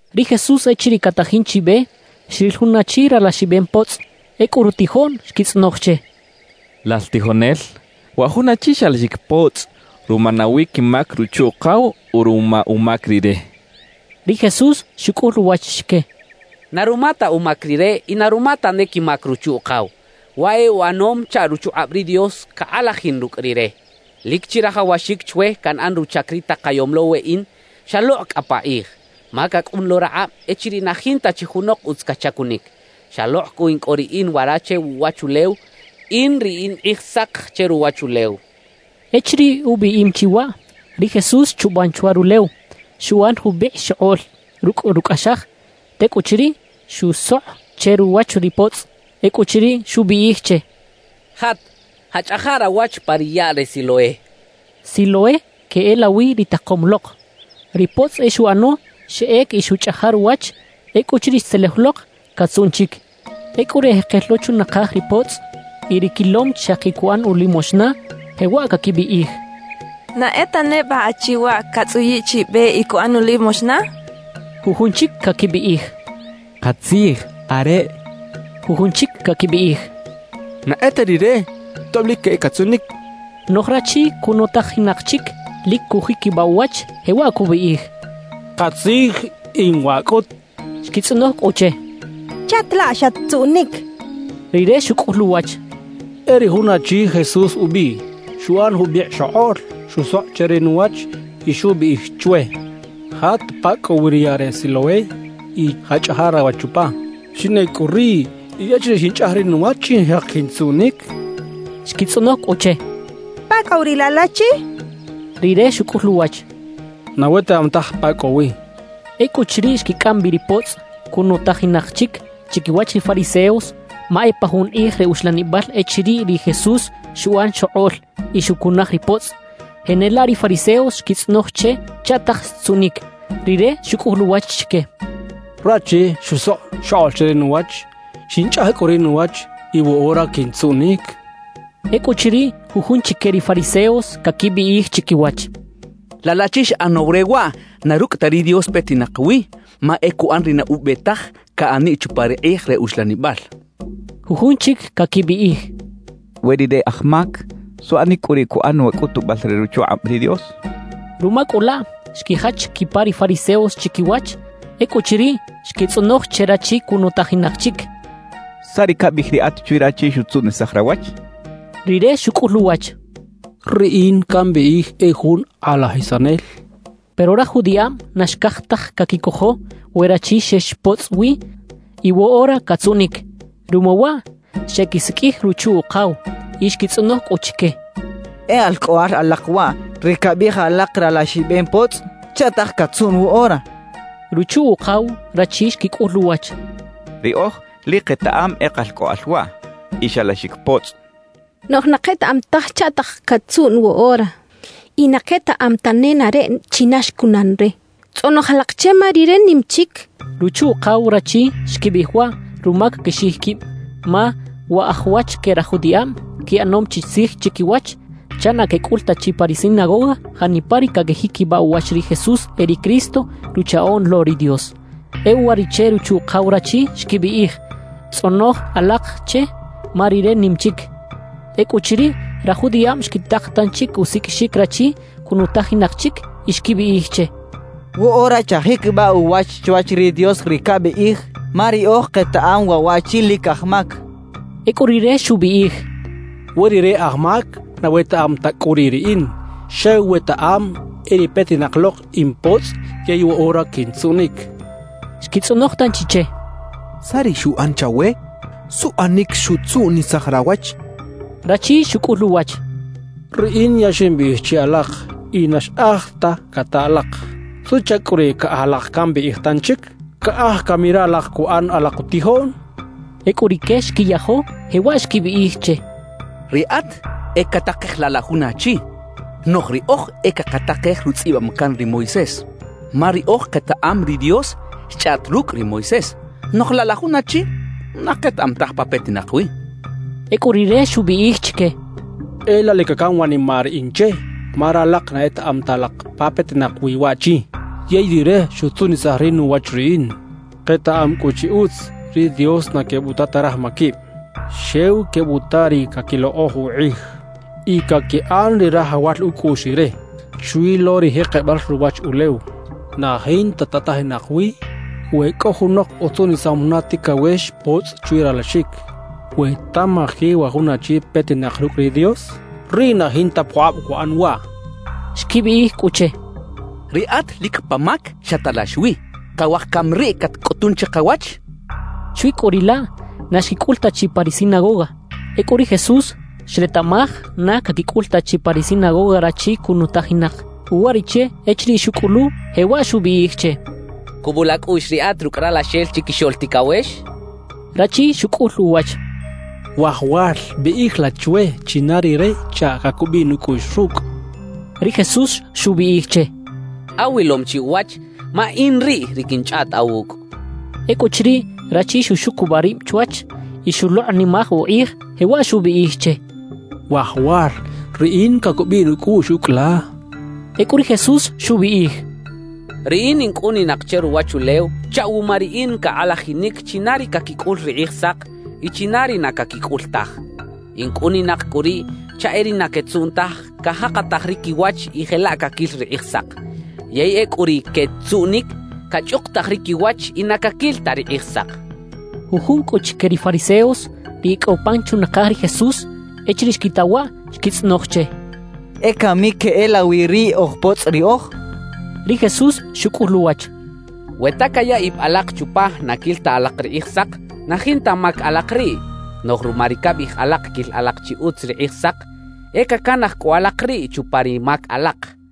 Ri Jesús echiriꞌ catajin chi be, xril jun achi ralaxibem potzꞌ. Ecꞌu rutijoꞌn xquitzꞌonoj che: —Lal tijonel, ¿wa jun achi xalaxic potzꞌ ruma nawi quimac ruchu-ukaw o ruma umac rire? —xechaꞌ. Ri Jesús xucꞌul uwach chique: —Na ruma ta umac rire y na ruma tane quimac ruchu-ukaw; waꞌ e uꞌanom chaꞌ ruchukꞌab ri Dios cakꞌalajin rucꞌ rire. Lic chirajawaxic chwe canꞌan ruchac ri takayom lo weꞌin xalokꞌ cꞌa pakꞌij, ma cacꞌun lo rakꞌab echiriꞌ na jinta chi junok utz cachacunic. Xalokꞌ cꞌu in cꞌo riꞌin wara che wuꞌwachulew, in ri in Kꞌijsak che ruwachulew —xchaꞌ. Echiriꞌ ubiꞌim chi waꞌ, ri Jesús xchuban chwa rulew, xuꞌan jubikꞌ xokꞌoꞌl rucꞌ rucꞌaxaj. Tecꞌuchiriꞌ, xusokꞌ che ruwach ri potzꞌ. Ecꞌuchiriꞌ, xubiꞌij che: —Jat, jaꞌchꞌaja rawach pa ri yaꞌ re Siloé —xchaꞌ. (Siloé queꞌelawi “ri Takom lok”.) Ri potzꞌ e xuꞌano; xeꞌec y xuꞌchꞌaja ruwach. Ecꞌuchiriꞌ xtzelej lok, catzuꞌn chic. Ecꞌu ri ejekel lo chunakaj ri potzꞌ y ri quilom xaki cuꞌan ulimoxna, jewaꞌ caquibiꞌij: «¿Na e ta neba achi waꞌ catzꞌuyiꞌ chiꞌ be y cuꞌan ulimoxna?» quechaꞌ. Jujun chic caquibiꞌij: «Katzij, areꞌ» quechaꞌ. Jujun chic caquibiꞌij: «Na e ta rire, tob lic e catzuꞌnic» quechaꞌ. Noꞌj rachi cunutajinak chic, lic cujiquibaꞌ uwach, jewaꞌ cubiꞌij: «Katzij, in waꞌ cꞌut» cachaꞌ. Xquitzꞌonoj cꞌu che: —¿Chaꞌta laꞌ xat-tzuꞌnic? —xecha che. Rire xucꞌul uwach: —E ri jun achi Jesús ubiꞌ, xuꞌan jubikꞌ xokꞌoꞌl, xusokꞌ che ri nuwach y xubiꞌij chwe: “Jat pa cꞌo wi ri yaꞌ re Siloé y jaꞌchꞌaja rawach chupa.” Xinꞌec cꞌu riꞌ, y echiriꞌ xinchꞌaj ri nuwach, xinjek quintzuꞌnic —xchaꞌ. Xquitzꞌonoj cꞌu che: —¿Pa cꞌo wi riꞌ laꞌ laꞌchi? —xecha che. Rire xucꞌul uwach: —Na wetaꞌam taj pa cꞌo wi —xchaꞌ. Ecꞌuchiriꞌ xquicꞌam bi ri potzꞌ cunutajinak chic chiquiwach ri fariseos; ma e pa jun kꞌij re uxlanibal echiriꞌ ri Jesús xuꞌan xokꞌoꞌl y xucunaj ri potzꞌ. Jenelaꞌ ri fariseos xquitzꞌonoj che chaꞌtaj xtzuꞌnic. Rire xucꞌul uwach chique: —Rachi xusokꞌ xokꞌoꞌl che ri nuwach, xinchꞌaj cꞌu ri nuwach y woꞌora quintzuꞌnic —xchaꞌ. Ecꞌuchiriꞌ, jujun chique ri fariseos caquibiꞌij chiquiwach: «Laꞌ laꞌchi xꞌanaw re waꞌ, na rucꞌ ta ri Dios petinak wi; ma e cuꞌan ri na ube taj caꞌaniꞌ chupa ri kꞌij re uxlanibal» quechaꞌ. Jujun chic caquibiꞌij: «We rire aj mac, ¿suꞌanic cꞌu riꞌ cuꞌan wa cꞌutubal re ruchukꞌab ri Dios?» quechaꞌ. Ruma cꞌu laꞌ, xquijach quipa ri fariseos chiquiwach. Ecꞌuchiriꞌ, xquitzꞌonoj che rachi cunutajinak chic: —¿Saꞌ ri cabiꞌij riꞌat chwi rachi xutzuꞌnisaj rawach? —xechaꞌ. Rire xucꞌul uwach: —Riꞌin cambiꞌij e jun kꞌalajisanel —xchaꞌ. Pero raj judiꞌab na xcaj taj caquicojo we rachi xex potzꞌ wi y woꞌora catzuꞌnic. Ruma waꞌ xequisiqꞌuij ruchu-ukaw, y xquitzꞌonoj cꞌu chique: —¿E alcꞌoꞌal alak waꞌ, ri cabiꞌij alak ralaxibem potzꞌ? ¿Chaꞌtaj catzuꞌn woꞌora? —xechaꞌ. Ruchu-ukaw rachi xquicꞌul uwach: —Riꞌoj lic ketaꞌam e kalcꞌoꞌal waꞌ y xalaxic potzꞌ. Noꞌj na ketaꞌam taj chaꞌtaj catzuꞌn woꞌora, y na ketaꞌam ta nenareꞌ china xcunan re. Tzꞌonoj alak che, ma rire nim chic —xechaꞌ. Ruchu-ukaw rachi xquibiꞌij waꞌ ruma caquixiꞌij quib, ma wa aj wach que raj judiꞌab quiꞌanom chi tzij chiquiwach chaꞌ na quecꞌul ta chi pa ri sinagoga janipa ri caquijiquibaꞌ uwach ri Jesús e ri Cristo, Ruchaꞌoꞌn lo ri Dios. E uwariꞌche ruchu-ukaw rachi xquibiꞌij: «Tzꞌonoj alak che, ma rire nim chic.» Ecꞌuchiriꞌ, raj judiꞌab xquitak tanchi usiqꞌuixic rachi cunutajinak chic y xquibiꞌij che: —Woꞌora chajiquibaꞌ uwach chwach ri Dios ri cabiꞌij. Ma riꞌoj ketaꞌam waꞌ waꞌchi lic aj mac —xechaꞌ. Ecꞌu rire xubiꞌij: —We rire aj mac na wetaꞌam ta cꞌu riꞌ riꞌin, xew wetaꞌam e ri petinak lok in potzꞌ yey woꞌora quintzuꞌnic —xchaꞌ. Xquitzꞌonoj tanchi che: —¿Saꞌ ri xuꞌan chawe? ¿Suꞌanic xutzuꞌnisaj rawach? —xechaꞌ. Rachi xucꞌul uwach: —Riꞌin ya ximbiꞌij che alak y na xꞌaj ta cata alak. ¿Suꞌchac cꞌu riꞌ caꞌaj alak cambiꞌij tanchic? ¿Caꞌaj cami ralak cuꞌan alak utijoꞌn? —xchaꞌ. Ecꞌu rique xquiyajo, jewaꞌ xquibiꞌij che: —Riꞌat e catakej laꞌ la jun achi, noꞌj riꞌoj e cakatakej rutzꞌibam can ri Moisés. Ma riꞌoj ketaꞌam ri Dios xchꞌaꞌt rucꞌ ri Moisés; noꞌj laꞌ la jun achi, na ketaꞌam taj pa petinak wi —xecha che. Ecꞌu rire xubiꞌij chique: —¡E laꞌ la lic cacam wanimaꞌ riꞌin che! Ma ralak na etaꞌam ta alak pa petinak wi waꞌchi, yey rire xutzuꞌnisaj ri nuwach riꞌin. Ketaꞌam cꞌu chi utz, ri Dios na quebuta ta raj maquib, xew quebuta ri caquilokꞌoj ukꞌij y caquiꞌan ri rajawal ucꞌuꞌx Rire. Chwi lo ri jekebal ruwachulew, na jinta tatajinak wi we cꞌo junok utzuꞌnisam juna ticawex potzꞌ chwi ralaxic. We tamaji wa jun achi petinak rucꞌ ri Dios, riꞌ na jinta pukꞌab cuꞌan waꞌ —xchaꞌ. Xquibiꞌij cꞌu che: —Riꞌat lic pa mac xatalax wi. ¿Cawaj cami riꞌ catcꞌutun chikawach? —xecha che. Chwi cꞌu riꞌ laꞌ, na xquicꞌul ta chi pa ri sinagoga. Ecꞌu ri Jesús xretaꞌmaj na caquicꞌul ta chi pa ri sinagoga rachi cunutajinak. Uwariꞌche echiriꞌ xucꞌulu, jewaꞌ xubiꞌij che: —¿Cubul acꞌuꞌx riꞌat rucꞌ Ralaxel Chiquixoꞌl Ticawex? —xchaꞌ. Rachi xucꞌul uwach: —Wajawal, biꞌij la chwe china rire chaꞌ cacubiꞌ nucꞌuꞌx rucꞌ —xchaꞌ. Ri Jesús xubiꞌij che: —Awilom chi uwach; ma in riꞌ ri quinchꞌaꞌt awucꞌ —xchaꞌ. Ecꞌuchiriꞌ, rachi xuxucubaꞌ rib chwach y xulokꞌnimaj ukꞌij, jewaꞌ xubiꞌij che: —Wajawal, riꞌin cacubiꞌ nucꞌuꞌx ucꞌ la —xchaꞌ. Ecꞌu ri Jesús xubiꞌij: —Riꞌin in cꞌuninak che ruwachulew chaꞌ wuma riꞌin cakꞌalajinic china ri caquicꞌul ri Kꞌijsak y china ri na caquicꞌul taj. In cꞌuninak cꞌu riꞌ chaꞌ e ri na quetzuꞌn taj, cajakataj ri quiwach y jelaꞌ caquil ri Kꞌijsak; yey ecꞌu ri “quetzuꞌnic”, cachꞌukutaj ri quiwach y na caquil ta ri Kꞌijsak —xchaꞌ. Jujun cꞌu chique ri fariseos, ri e cꞌo pan chunakaj ri Jesús, echiriꞌ xquita waꞌ, xquitzꞌonoj che: —¿E cami queꞌelawi riꞌ oj potzꞌ riꞌoj? —xechaꞌ. Ri Jesús xucꞌul uwach: —We ta caya ib alak chupa na quil ta alak ri Kꞌijsak, na jinta mac alak riꞌ. Noꞌj ruma ri cabiꞌij alak quil alak chi utz ri Kꞌijsak, e cacanaj cꞌu alak riꞌ chupa ri mac alak —xchaꞌ.